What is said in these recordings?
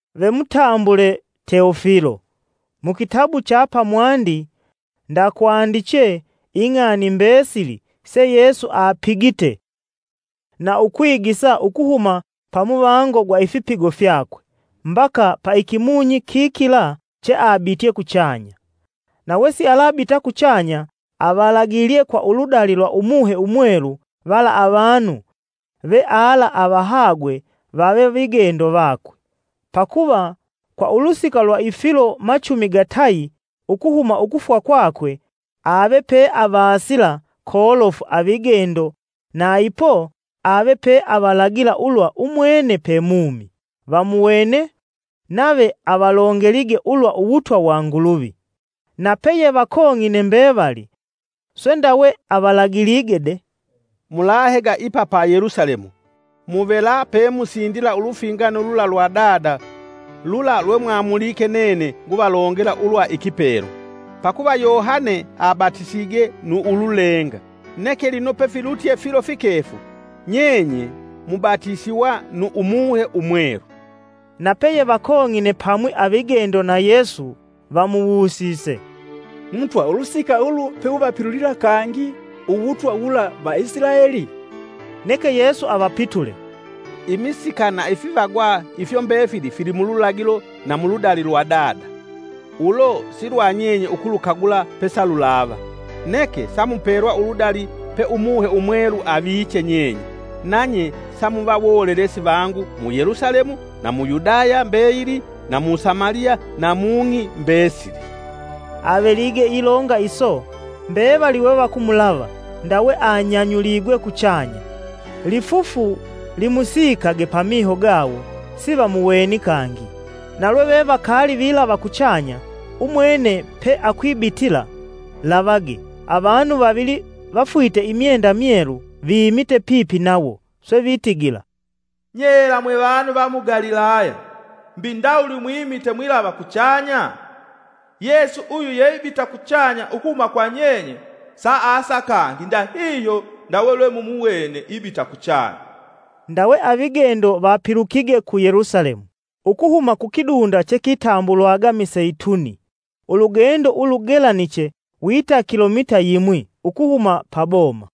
Ve mutambule Teofilo, mu kitabu cha pamwandi ndakwandiche ing'ani mbesili sa Yesu seapigite na ukwigisa ukuhuma pamuvango gwa ifipigo fyakwe mbaka pa ikimunyi kikila cheabitye kuchanya. Na wesialabita kuchanya avalagilye kwa uludali lwa Umuhe Umwelu vala avanu veala avahagwe vave vigendo vakwe. Pakuva kwa ulusika lwa ifilo machumi gatayi ukuhuma ukufwa kwakwe ave peavasila kolofu avigendo na ipo ave peavalagila ulwa umwene pe mumi. Vamuwene, nave avalongelige ulwa Uwutwa wa Nguluvi. Na peyevakong'ine mbevali, swe ndawe avalagilige de: “Mulahega ipa pa Yelusalemu, muvela pemusindila ulufingano lula lwa Dada lula lwemwamulike nene nguvalongela ulwa ikipelwa. Pakuva Yohane abatisige nu ululenga, neke lino pefilutye filo fikefu, nyenye mubatisiwa nu Umuhe Umwelu.” Napeyevakong'ine pamwi avigendo na Yesu vamuwusise, “Mutwa ulusika ulu peuvapilulila kangi Uwutwa wula Vaisilaeli?” Neke Yesu avapitule, “Imisika na ifivagwa ifyo mbefili filimululagilo na muludali lwa Dada, ulo silwanyenye ukulukagula pesalulava. Neke samupelwa uludali pe Umuhe Umwelu aviche nyenye, nanye samuva wolelesi vangu mu Yelusalemu na mu Yudaya mbeyili na mu Samaliya na mung'i mbesili.” Avelige ilonga iso, mbevali wevakumulava ndawe, anyanyuligwe kuchanya; lifufu limusikage pamiho gawo sivamuweni kangi. Na lwevevakali vilava kuchanya umwene peakwibitila, lavage avanu vavili vafwite imyenda myelu, vimite pipi nawo. Swe vitigila, “Nyela mwevanu va mu Galilaya! mbi ndawuli mwimite mwilava kuchanya? Yesu uyu yeibita kuchanya ukuhuma kwa nyenye saasa kangi ndahihyo ndawe lwemumuwene ibita kuchanya.” Ndawe avigendo vapilukige ku Yelusalemu ukuhuma kukidunda chekitambulwaga miseitumi, ulugendo ulugelaniche wita kilomita yimwi ukuhuma paboma.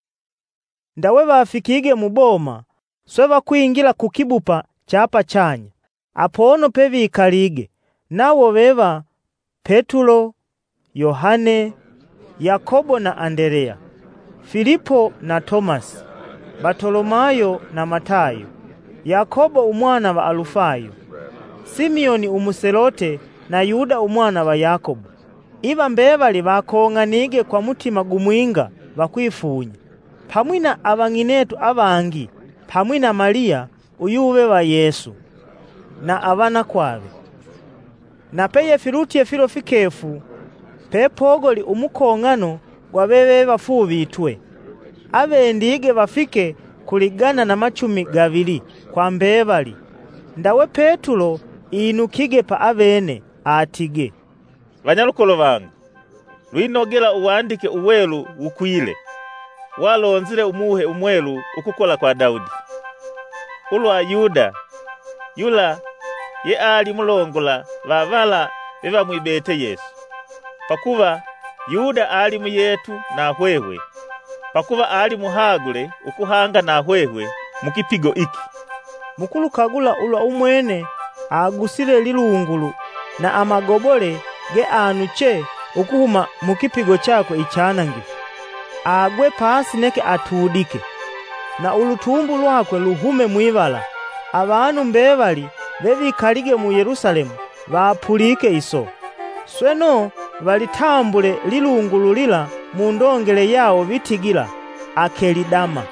Ndawe wafikige mu boma swe vakwingila kukibupa cha pachanya, apono pevikalige nawo veva: Petulo, Yohane, Yakobo na Andeleya, Filipo na Tomasi, Batolomayo na Matayo, Yakobo umwana va Alufayo, Simioni umuselote na Yuda umwana va Yakobo. Iva mbevali vakong'anige kwa mutima gumwinga vakwifunya, pamwi na avang'inetu avangi pamwi na Maliya uyuve va Yesu na avanakwave avakwamisi. Na peyefilutye filo fikefu pepogoli umukong'ano gwa vevevafuuvitwe avendige vafike ku ligana na machumi gavili kwa mbevali ndawe Petulo inukige pa avene, atige, “Vanyalukolo vangu lwinogela Uwandike Uwelu wukwile, walonzile Umuhe Umwelu ukukola kwa Daudi, ulwa Yuda, yula yeali mulongola vavala vevamwibete Yesu. Pakuva Yuda alimuyetu na hwehwe, pakuva alimuhagule ukuhanga na hwehwe mukipigo iki.” ( “Mukulukagula ulwa umwene agusile lilungulu, na amagobole geanuche ukuhuma mukipigo chakwe ichanangifu. Agwe pasi neke atudike, na ulutumbu lwakwe luhume mwivala. Avanu mbevali vevikalige mu Yelusalemu, vapulike iso, sweno valitambule lilungulu lila mundongele yawo vitigila, ‘Akeli Dama’,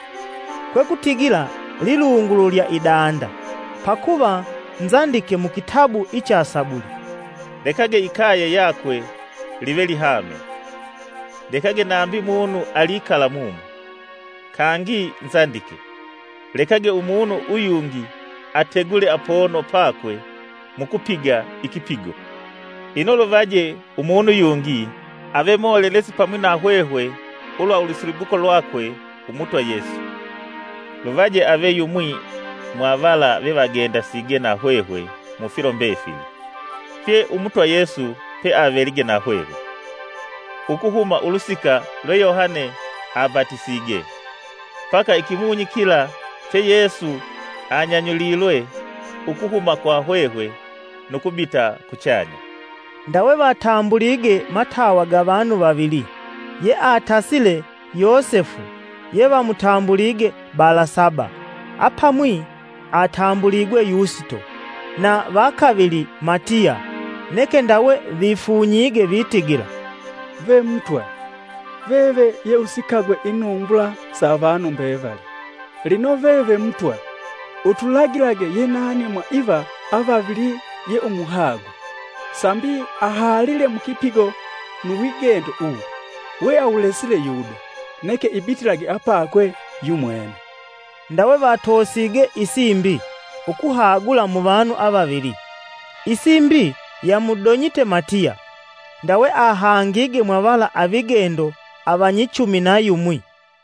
kwekutigila, ‘Lilungulu lya Idanda.’) Pakuva nzandike mu kitabu icha inzimbo (Sabuli): ‘Lekage ikaye yakwe live lihame; Lekage nambi munu alikala mumo.’ Kangi nzandike: ‘Lekage umunu uyungi ategule apono pakwe mukupiga ikipigo.’ “Ino lunoje umunu yungi, ave molelesi pamwi na hwehwe ulwa ulusilibuko lwakwe Umutwa Yesu. Luvaje ave yumwi mwa vala vevagendasige na hwehwe mufilo mbefili, fye Umutwa Yesu pe avelige na hwehwe, ukuhuma ulusika lwe Yohane abatisige, mbaka ikumunyi kila che Yesu anyanyulilwe ukuhuma kwa hwehwe nu kubita kuchanya.” Ndawe vatambulige matawa ga vanu vavili, yeatasile Yosefu yevamutambulige Balasaba (apamwi atambuligwe Yusito), na vakavili Matiya. Neke ndawe vifunyige vitigila, “Ve Mutwa, veve yeusikagwe inumbula sa avanu mbevali, lino veve Mutwa, utulagilage yenani mwa iva avavili yeumuhagwe, sambi ahalile mukipigo nu wigendo uwu, weawulesile Yuda, neke ibitilage apakwe yumwene.” Ndawe vatosige isimbi ukuhagula muvanu avavili, isimbi yamudonyite Matiya ndawe ahangige mwa vala avigendo avanyichumi na yumwi.